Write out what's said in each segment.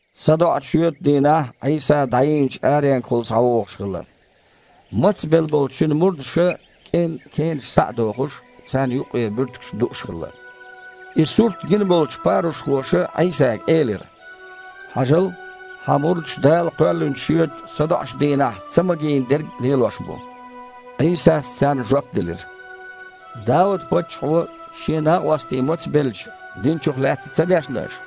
СадоІучу шоьтан дийнахь Іийса дІайийначу аренгахула схьавогІуш хилла. Мацбелла болчу Цуьнан мурдаша, кІен кенаш схьа а дохуш, царна юккъера буьртигаш дууш хилла. И сурт гина болчу парушхоша Іийсага элира: «Хьажал! Хьан мурдаш Дала кхоьллинчу шоьтан садоІучу дийнахь ца магийна дерг лелош бу». Іийсас царна жоп делира: «Дауд-паччахьо, шен накъостий мацбелча, диначух лаьцна ца дешна аша?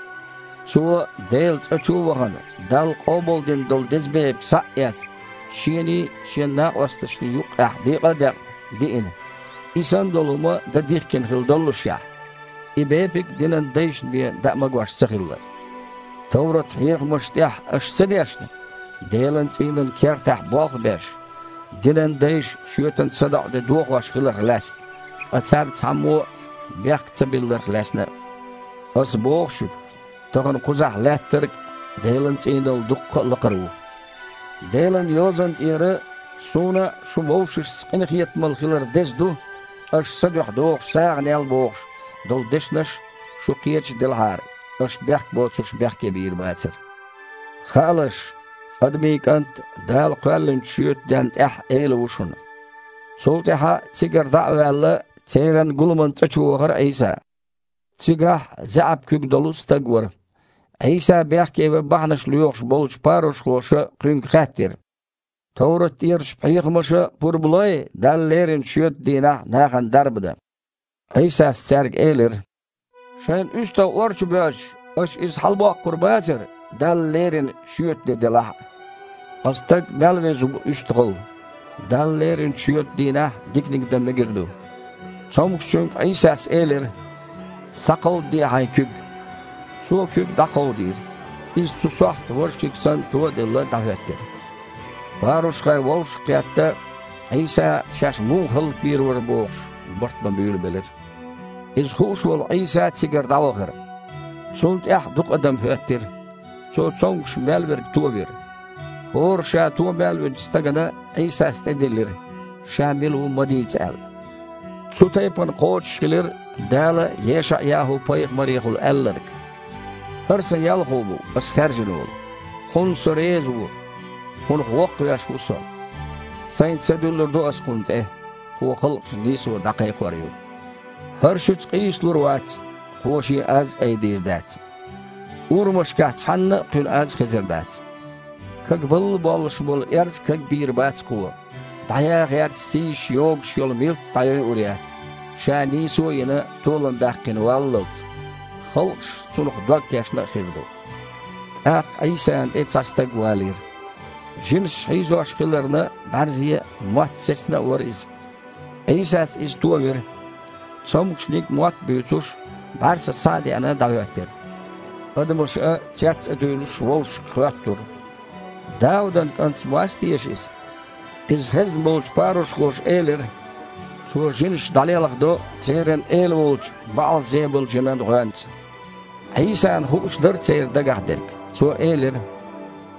Цо, Делан цІа чу а вахана, Далла къобалдина долу деза бепиг, схьа а эцна, шений, шен накъосташний юккъехь декъа а декъна, диина, и санна долу хІума дан дихкина хилла доллушехь. И бепиг динан дайшна бен даа магош ца хилла. Товрат-хьехамаш тІехь аша ца дешна, Делан цІийнан кертахь болх а беш, динан дайша шоьтан садоІу де дохош хиларх лаьцна, ткъа царна цхьаммо а бехк ца билларх лаьцна а? Аса боху шуьга, тахана кхузахь Лаьттарг Делан цІийнал дуккха а лакхара ву. Делан Йозанна тІера „Суна шун вовшашца къинхетамалла хилар деза ду, аша Сан дуьхьа дохучу сагІанел“ – бохуш долу дешнех шу кхеташ делахьара, аша бехк боцурш бехке бийр бацара. Хаалаш, Адамийн КІант Дала кхоьллинчу шоьтан денна тІехь а Эла ву шуна». Цул тІаьхьа цигара дІа а ваьлла, церан гуламан цІа чу вахара Іийса. Цигахь заьІап куьг долу стаг вара. Іийса бехкеван бахьанаш лоьхуш болчу парушхоша Кхуьнга хаьттира: «Товрат тІерачу хьехамаша пурба лой Далла леринчу шоьтан дийнахь нахана дарба дан?» Іийсас цаьрга элира: «Шайн уьстагІ ор чу боьжча, аша иза хьалабоккхур бацара, Далла леринчу шоьтан де делахь а? Ткъа стаг мел веза ву уьстагІал! Далла леринчу шоьтан дийнахь диканиг дан мегар ду». Цомгушчуьнга Іийсас элира: «Схьакховдаде хьайн куьг!» Цо куьг дІакховдийра. Иза цу сохьта, важа куьг санна, то а делла, дІахІоьттира. Парушхой, вовшах а кхетта, Іийса шаьш муха хІаллаквийр вара бохуш, барт бан буьйлабелира. Иза хууш волу Іийса цигара дІавахара. Цунна тІаьхьа дукха адам хІоьттира. Цо цомгуш мел верг товира. ХІора Ша то мел винчу стагана Іийсас тІедиллира, Ша мила ву ма дийца аьлла. Цу тайпана кхочушхилира Дала ЕшаІ-ЯхІу-пайхамарехула аьлларг: «ХІара Сан Ялхо ву, Ас хаьржина волу. Кхунна Со реза ву, Кхунах воккхавеш ву Со. Сайн Са дуьллур ду Ас Кхунна тІе, Кхо халкъашна нийсо дІакхайкхор ю! ХІара шуьца къийсалур а вац, Кхо Шен аз а айдийр дац. Урамашкахь цхьанна а Кхуьнан аз а хезар дац. Кагбалла боллуш болу эрз а кагбийр бац Кхо, дІаян гІерташ сийсаш йогуш йолу милт а дІайойур яц, Ша, нийсо а йина, толам баьккхина валлалц. Халкъаш цунах дог тешна а хир ду!» ТІаккха Іийсана тІе цхьа стаг валийра. Жинаша хьийзош хиларна, бІаьрзе а, мотт а сецна а вара иза. Іийсас иза товира: цомгушниг, мотт а буьйцуш, бІаьрса схьа а деана, дІахІоьттира. Адамаша, цец а дуьйлуш, вовшашка хоьттура: « Даудан КІант-м вац теша Иза?» Иза хезна болчу парушхоша элира: «Цо жинаш дІалелхадо церан эла волчу БаІал-Зебула-жинан гІоьнца». Іийсана хууш дара церан дагахь дерг. Цо элира: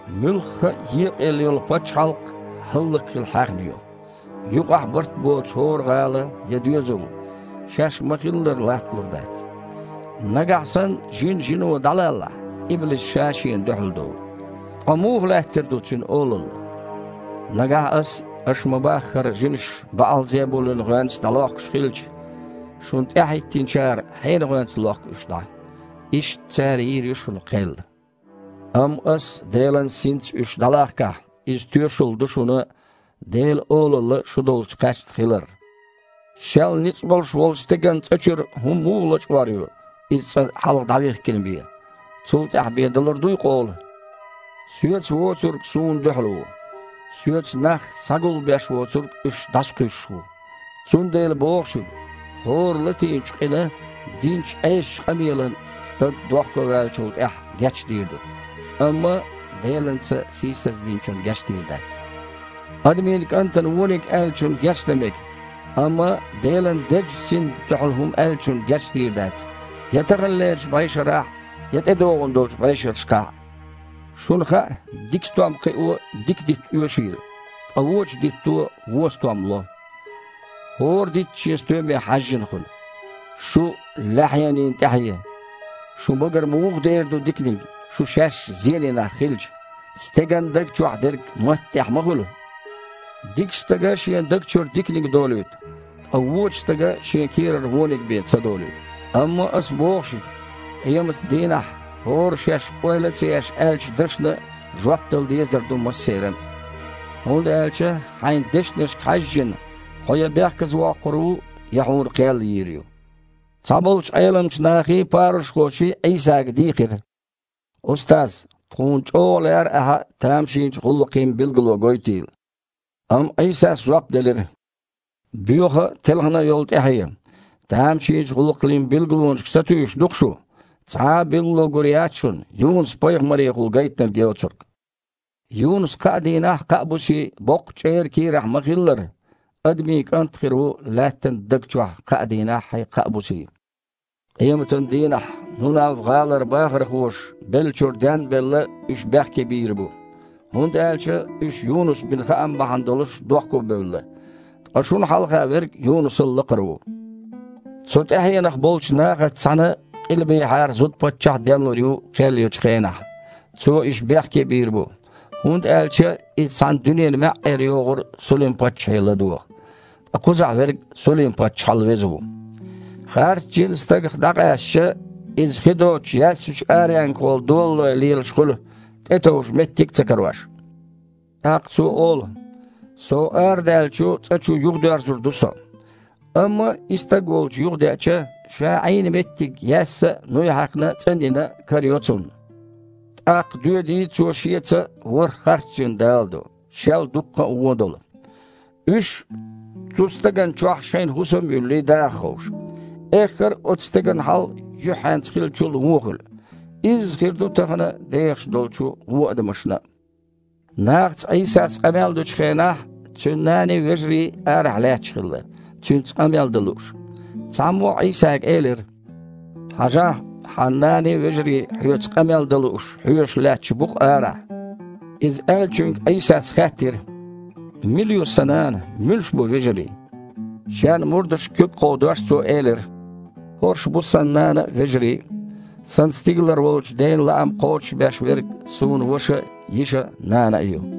«Муьлхха а екъаелла йолу пачхьалкх хІаллакьхила хьаьхна ю. Юкъахь барт боцу хІора гІала я доьзал шаьш ма-хиллара латталур дац. Нагахь санна жин жино дІалаллахь, иблис ша-шена дуьхьал долу. Ткъа муха лаьттар ду цуьнан олалла? Нагахь Ас, аша ма-баххара, жинаш БаІал-Зебулин гІоьнца дІалохкуш хилча, шуна тІаьхьахІоьттинчара хьенан гІоьнца лохку уьш дІа? Иштта, цара йийр ю шуна кхел. Амма Аса Делан Синца уьш дІалахкахь, иза тоьшалла ду шуна Делан Олалла шу долчу кхаьчна хилар. Шел ницкъ болуш волчу стеган цІа чуьра хІума муха лачкъор ю, иза цкъа хьалха дІавихкина бен? Цул тІаьхьа бен далур дуй къола? Соьца воцург Суна дуьхьал ву, Соьца нах схьагулбеш воцург уьш дІасакхуьйсуш ву. Цундела боху шуьга: хІора латийначу къина, динчу Іесачу къамелана стаг дохковаьллачул тІаьхьа гечдийр ду, амма Делан Са сийсаздинчунна гечдийр дац. Адамийн КІантана вониг аьллачунна гечдан мега, амма Делан Дезачу Синна дуьхьал хІума аьллачунна гечдийр дац я таханлерчу бІешарахь а, я тІедогІун долчу бІешерашкахь а. Шуна хаьа дика стом кхио дика дитт оьшийла, ткъа вочу дитто вон стом ло. ХІора дитт шен стоьме хьаьжжина хуьлу. Шу, лаьхьанийн тІаьхье! Шун багара муха дер ду диканиг, шу шаьш зене нах хилча? Стеган даг чохь дерг матта тІехь ма хуьлу. Дикачу стага шен даг чуьра диканиг долуьйту, ткъа вочу стага шен кийрара вониг бен ца долуьйту. Амма Аса боху шуьга: къематан дийнахь хІора шаьш ойла а ца еш аьллачу дашна жоп дала дезар ду массеран а. ХІунда аьлча хьайн дешнашка хьаьжжина хьо я бехказавоккхур ву, я хьуна кхел йийр ю». Цхьаболчу Іеламчу нахий, парушхоший Іийсага дийхира: «Устаз! Тхуна чІогІа лаьара Ахьа тамашийна гІуллакхийн билгало гойтийла!» Амма Іийсас жоп делира: «Боьха а, телхина а йолу тІаьхье! Тамашийна гІуллакхийн билгалонашка сатуьйсуш ду-кх шу. Цхьа а билгало гур яц шуна, Юнус-пайхамарехула гайтинарг йоцург. Юнус кхаа дийнаххьий, кхаа бусий боккхачу чІеран кийрахь ма-хиллара, Адамийн КІант а хир ву Лаьттан даг чохь кхаа дийнаххьий, кхаа бусий. Къематан дийнахь Нунав-гІалара бахархоша, беллачуьра ден а белла, уьш бехке бийр бу, хІунда аьлча уьш Юнуса бина хаам бахьана долуш дохкобевлла, ткъа шуна хьалха Верг Юнусал лакхара ву. Цу тІаьхьенах болчу нахаца цхьаьна къилбехьара зуда-паччахь а денлур ю кхел ечу хенахь, цо уьш бехке а бийр бу, хІунда аьлча иза цхьана дуьненан маьІІера йогІура Сулим-паччахье ладогІа. Ткъа кхузахь Верг Сулим-паччахьал веза ву». «Харцжин стагах дІакъаьстича, иза хи доцучу яьссачу аренгахула долалой лелаш хуьлу, тІетовжа меттиг а ца карош. ТІаккха цо олу: „Со арадаьллачу цІа чу юхадоьрзур ду со“. Амма и стаг волчу юхадеъча, ша Іийна меттиг яьсса а, нуй хьаькхна а, цІанйина а карайо цунна. ТІаккха доьдий, цо шеца ворхІ харцжин даладо, шел дуккха а вон долу. Уьш, цу стагана чохь шайн хІусам а юьллий, даха ховшу. Эххар а оцу стеган хьал юьххьенца хиллачул а вон хуьлу. Изза хир ду тахана дехаш Іаш долчу вон адамашца а». Нахаца Іийсас къамел дечу хенахь Цуьнан наний, вежарий арахь лаьтташ хилла, Цуьнца къамел дан лууш. Цхьаммо Іийсага элира: «Хьажахь, Хьан наний, вежарий, Хьоьца къамел дан лууш, хьоьжуш лаьтташ бу-кх арахь». Иза аьллачуьнга Іийсас хаьттира: «Мила ю Сан нана, муьлш бу вежарий?» Шен мурдашка куьг а кховдош, Цо элира: «ХІорш бу Сан нана а, вежарий а! Сан стигалара волчу Ден лаам кхочушбеш верг Суна ваша а, йиша а, нана а ю!»